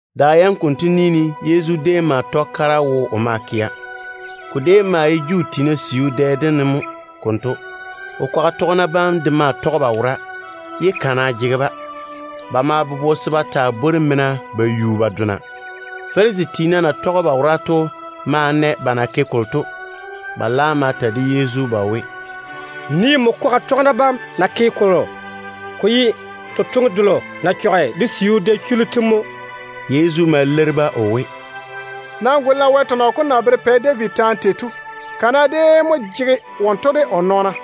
Da yam konto ni ne Yezu déem ma tɔge kara wo o maa kɛa. Ko déem maa ye Juu tiina siu dɛ dem ne mo konto. O kwaga tɔgena bam de maa tɔge ba wora, ye kana jege-ba. Ba ma bobo se ba taa bwori mena ba yui ba dona. Farisi tiina na tɔge ba wora to ma na ba na ke kolo to. Ba laam ma ta de Yezu ba we, “Nii nmo kwaga tɔgena bam na ke kolo. Ko ye totoŋe delo na chɔge Wɛ siu dɛ chullu tem to mo.” Yezu ma leiri-ba o we, “Nam guli-na Wɛ tɔnɔ kom na bere Pɛ David taane tei to. Kana déem mo jege wonto de o nɔɔna.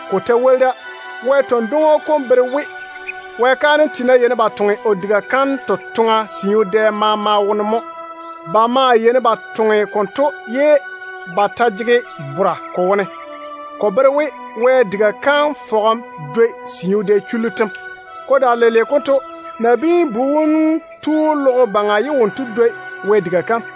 Ko ta woli da, Wɛ tɔn-dwoŋo kom bere we Wɛ kaanem tiina yeini ba toŋe o diga kam totoŋa siu dɛ maama wone mo. Ba maa yeini ba toŋe konto ye ba ta jege bora ko wone. Ko bere we Wɛ diga kam fɔgem dwoi siu dɛ chullu tem. Ko daare leile konto, Nabiin-bu wom tu logo baŋa ye wonto dwoi Wɛ diga kam.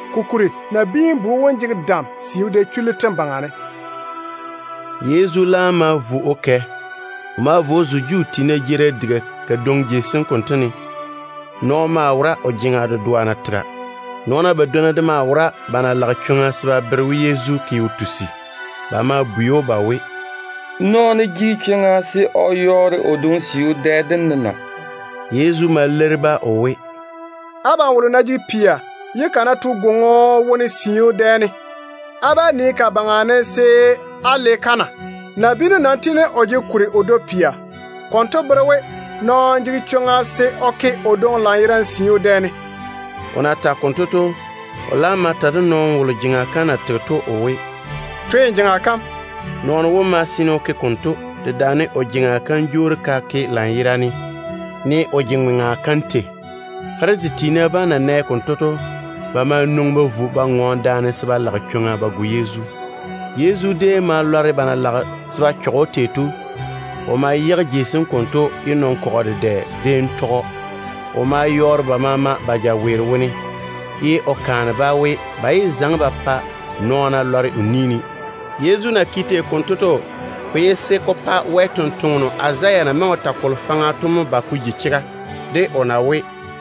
Kokuri Nabiin-bu wom jege dam siu dɛ chullu tem baŋa ne.” Yezu laam ma vo o kɛ. O ma vo o zo Juu tiina jeerim diga kadwoŋi jei sem konto ne. Nɔɔno maa wora o jeŋa dedoa na tega. Nɔɔna badwonna de maa wora ba na lage chwoŋa se ba bere we Yezu ke o tusi. Ba ma bwei‑o ba we, “Nɔɔno jege chwoŋa se o yɔɔre o dwoŋi siu dɛ dem ne na?” Yezu ma leiri-ba o we, “Abam wolo ná jege pia, ye ka ná to gwoŋo wone siu dɛ dem ne, á bá nii ka baŋa ne se á le-ka na? Nabiinu nam tiini o jege kuri o dwoi pia. Konto bere we nɔɔno jege chwoŋa se o ke o dwoŋi lanyerane siu dɛ dem ne.” O na tage konto to, o laam ma ta de nɔɔno wolo jeŋa kam na tege to o we, “Twe n jeŋa kam.” Nɔɔno wom ma seene o ke konto, dedaane o jeŋa kam jwoori ka ke lanyerane, ne o je-ŋoŋa kam tei. Farisi tiina bam na nɛ konto to, ba ma nwoŋi ba vo ba ŋɔɔne daane ye ba lage chwoŋa se ba go Yezu. Yezu déem ma lɔre ba na lage se ba chɔge‑o tei to. O ma yage jei sem konto o kɛ ye nɔn-kɔgɔ dedɛ déem tɔge‑o. O ma yɔɔre ba maama jaweero tem, ye o kaane-ba o we, ba yé zaŋe ba pa nɔɔna lɔre o ni ne. Yezu na ke tei konto to, ko ye se ko pa Wɛ sampwora Izaya na maŋe o ta Wɛ kwora kalo faŋa faŋa to mo ba ka ji chega, de o na we: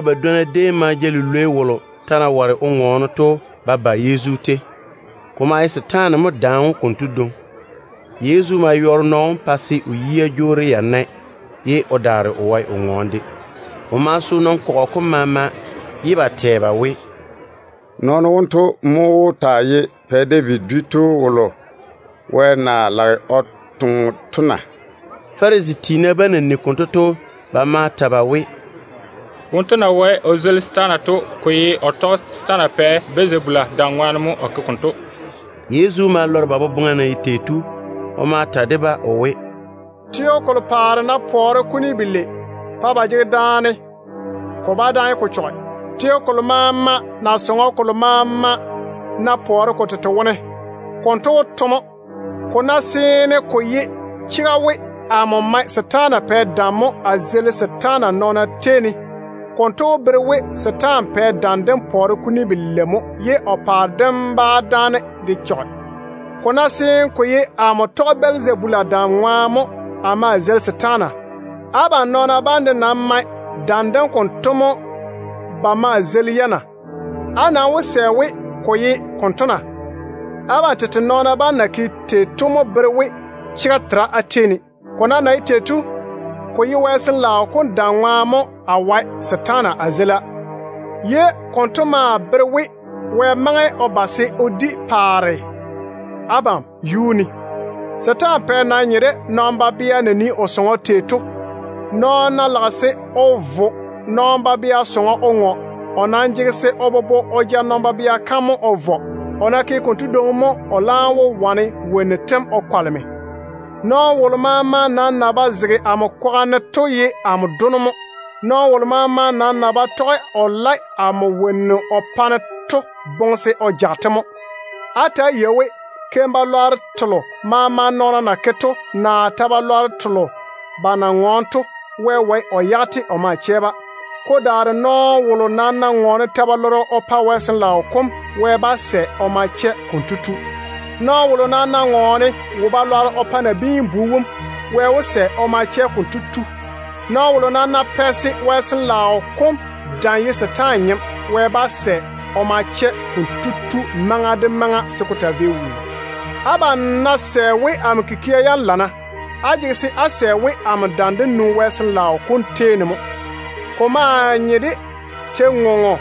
Nɔɔna badwonna déem ma ja lilwei wolo ta na ware o ŋɔɔne to ba ba Yezu tei. Ko maa ye setaane mo daane‑o konto dwoŋi. Yezu ma yɔɔre nɔɔno wom pa se o yia jwoori ya nae ye o daare o wae o ŋɔɔne de. Ko ma so nɔn-kɔgɔ kom maama, ye ba tɛ ba we, “Nɔɔno wonto mo wó taa ye Pɛ David dwi tu wolo Wɛ na lage o toŋe to na?” Farisi tiina bam na nigi konto to, ba ma ta ba we, “Wonto na wae o zeili setaana to, ko ye o tɔge setaana pɛ Bɛlzabula dam ŋwaane mo o ke konto.” Yezu ma lɔre ba boboŋa na ye tei to. O ma ta de-ba o we, “Teo kolo paare ná pɔɔre kuni belei pa ba jege daane, ko bá dáane ko chɔge. Teo kolo maama naa sɔŋɔ kolo maama ná pɔɔre ko tete wone, konto wó to lela mo. Ko ná seene ko ye chega we amo mae setaana pɛ dam mo a zeili setaana, konto wó bere we setaana pɛ dam dem pɔɔre belei mo ye o paare dem bá dáane de chɔge. Ko ná seene ko ye amo tɔge Bɛlzabula dam ŋwaane mo a ma a zeili setaana, abam nɔɔna bam de nam mae dam dem konto mo ba maa zeili-ya na? Á nam wó sɛ we ko ye konto na? Abam tete nɔɔna bam na ke tei to mo bere we chega tera á tei ne. Ko nam na ye tei to, ko ye Wɛ Sin-laao kom dam ŋwaane mo pa se a wae setaana a zeila, ye konto maa bere we Wɛ maŋe o ba se o di paare abam yuu ne. Setaana pɛ nam nye de nɔn-babea na nii o sɔŋɔ tei to mo. Nɔɔno ná lage se o vo nɔn-babea sɔŋɔ o ŋɔ, o jege se o bobo o ja nɔn-babea kam mo o vɔ. O ná ke konto dwoŋi mo o laam wó wane wonnu tem o kwaleme. Nɔɔno wolo maama nam na ba zege amo kwaga ne to ye amo dono mo. Nɔɔno wolo maama na ba tɔge o lae amo wonnu o pa-ne to boŋe se o jage-te mo. Á ta‑á yei we, keim-balwaaro telo maama nɔɔna na ke to, naa ta-balwaaro telo ba na ŋɔɔne to, Wɛ wae o yage-te o ma chɛ-ba. Ko daare nɔɔno wolo nam ná ŋɔɔne ta-balɔrɔ o pa Wɛ Sin-laao kom, Wɛ bá sɛ se o ma chɛ konto tu. Nɔɔno wolo nam ná ŋɔɔne wo-balwaaro o pa Nabiin-bu wom, Wɛ wó sɛ se o ma chɛ konto tu. Nɔɔno wolo nam ná pɛ se Wɛ Sin-laao kom dam ye setaane nyem, Wɛ bá sɛ se o ma chɛ konto tu maŋa de maŋa se ko taa vei wuu. Abam ná sɛ we amo kikia yam lana, á jege se á sɛ we amo dam dem nwoŋi Wɛ Sin-laao kom tei ne mo. Ko nye de tei-ŋoŋo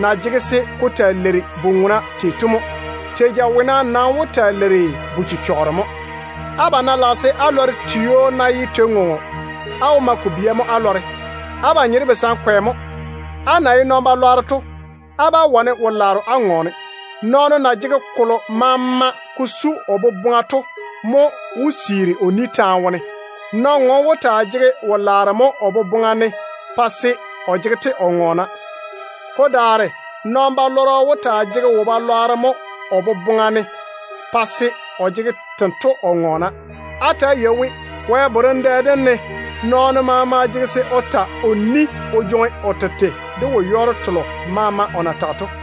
na jege se ko taa leiri bu-ŋona tei to mo. Tei-jawona nam wó taa leiri bu-chechɔgero mo. Abam ná lage se á lɔre tio ná ye tei-ŋoŋo, á wó ma ko bia mo á lɔre. Abam nye de basankwe mo. Á na ye nɔn-balwaaro to, á bá wane wo-laaro á ŋɔɔne. Nɔɔno na jege kolo maama o boboŋa ne to mo wó siiri o ni taane wone. Nɔn-ŋom wó taa jege wo-laaro mo o boboŋa ne pa se o jege-te o ŋɔɔna. Ko daare nɔn-balɔrɔ wó taa jege wo-balwaaro mo o boboŋa ne pa se o jege tento o ŋɔɔna. Ta‑á yei-na we, Wɛ borem dɛ dem ne nɔɔno maama jege se o ta o ni mo o jwoŋi o tete de wo-yɔɔro telo maama o na tage to mo.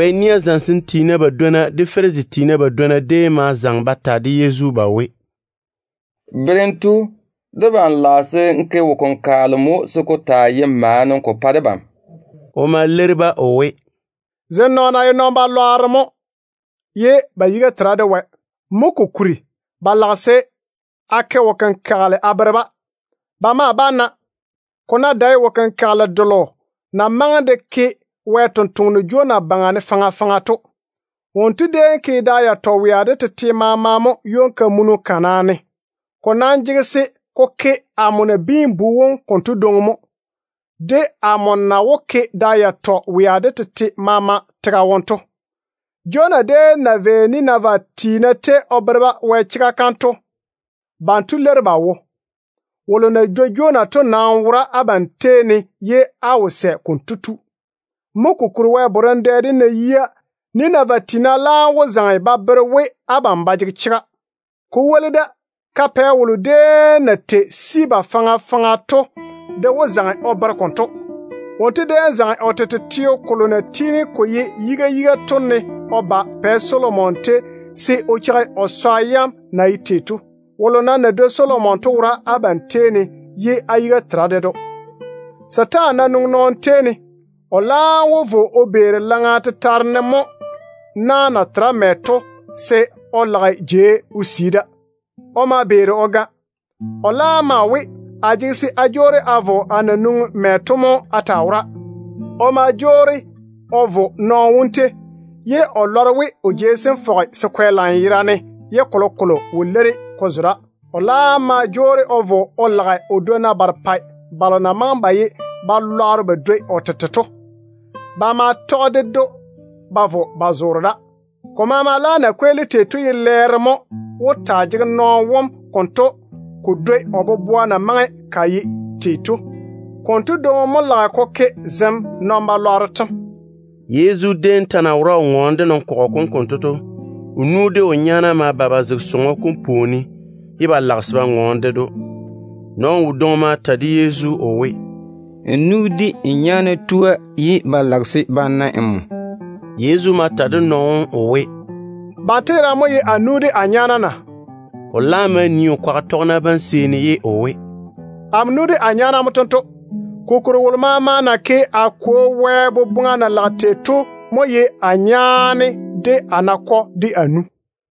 Wɛ nia zamesem tiina badwonna de Farisi tiina badwonna déem ma zaŋe ba ta de Yezu ba we, “Berem tu, debam lage se n ke wo-kenkagele mo se ko taa ye maana ko pa debam.” O ma leiri-ba o we, “Zem nɔɔna ye wo-lwan-keira mo ye ba yiga tera de Wɛ. Mo kokuri ba lage se a ke wo-kenkagele a bere-ba. Ba maa bá na, ko ná dae wo-kenkagele delo na maŋe de ke Wɛ sampwora Jonah baŋa ne faŋa faŋa to. Wonto déem ke da yatɔ wea de tete maama mo ywon-kamunu kana ne. Ko nam jege se ko ke amo Nabiin-bu konto dwoŋi mo, de amo na wó ke da yatɔ wea de tete maama tega kuri ne to. Jonah déem na vei Ninevɛ tiina tei o bere-ba Wɛ chega kam to, banto leiri ba wo. Wolo na dwoi Jonah to nam wora abam tei ne ye á wo sɛ konto tu. Mo kokuri Wɛ borem dɛ dem ná yia, Ninevɛ tiina laam wó zaŋe ba bere we abam ba jege chega. Ko woli da, ka-pɛ wolo déem na tei Sebaa faŋa faŋa to de wó zaŋe o bere konto. Wonto déem zaŋe o tete teo kolo na tiini ko ye yiga yiga to ne o ba Pɛ Solomon tei se o cheigi o swa yam na ye tei to. Wolo nam na dwoi Solomon to wora abam tei ne ye á yiga tera ded‑o. Ba ná zeili setaane se o yage nɔɔno, o laam wó vo o beeri laŋa tetare ne mo na na tera mɛ to se o lage jei o sii da. O ma beeri o ga. O laam maa we, ‘A jege se a jwoori a vo a na nwoŋi mɛ to mo a taa wora.’ O ma jwoori o vo nɔɔno wom tei, ye o lɔre we o jei sem fɔge se kwɛ lanyerane ye kolokolo wo leiri ko zo da. O laam ma jwoori o vo o lage o dwonna barepɛ balo na maŋe ba ye balwaaro ba dwoi o tete to. Ba ma tɔge ded‑o ba vo ba zoore da. Ko maama laam na kweeli tei to ye lɛɛro mo wó taa jege nɔɔno wom konto se ko dwoni o boboa kam na maŋe ka ye tei to. Konto dwoŋi mo lage ko ke zem nɔn-balwaaro tem.” Yezu déem ta na wora o ŋɔɔne de nɔn-kɔgɔ kom konto to, o nu de o nyaana ma ba ba zege sɔŋɔ kom pwooni ne, ye ba lage se ba ŋɔɔne ded‑o. Nɔɔno wodwoŋi ma ta de Yezu o we, “N nu de n nyaana tua, ye ba lage se ba na nmo.” Yezu ma ta de nɔɔno wom o we, “Banto yerane mo ye a nu de a nyaana na?” O laam ma nii o kwaga tɔgena bam seeni ye o we, “Amo nu de a nyaana mo tento. Kokuri wolo maama na ke a Kwo Wɛ boboŋa na lage tei to mo ye a nyaane, de a nakɔ, de a nu.”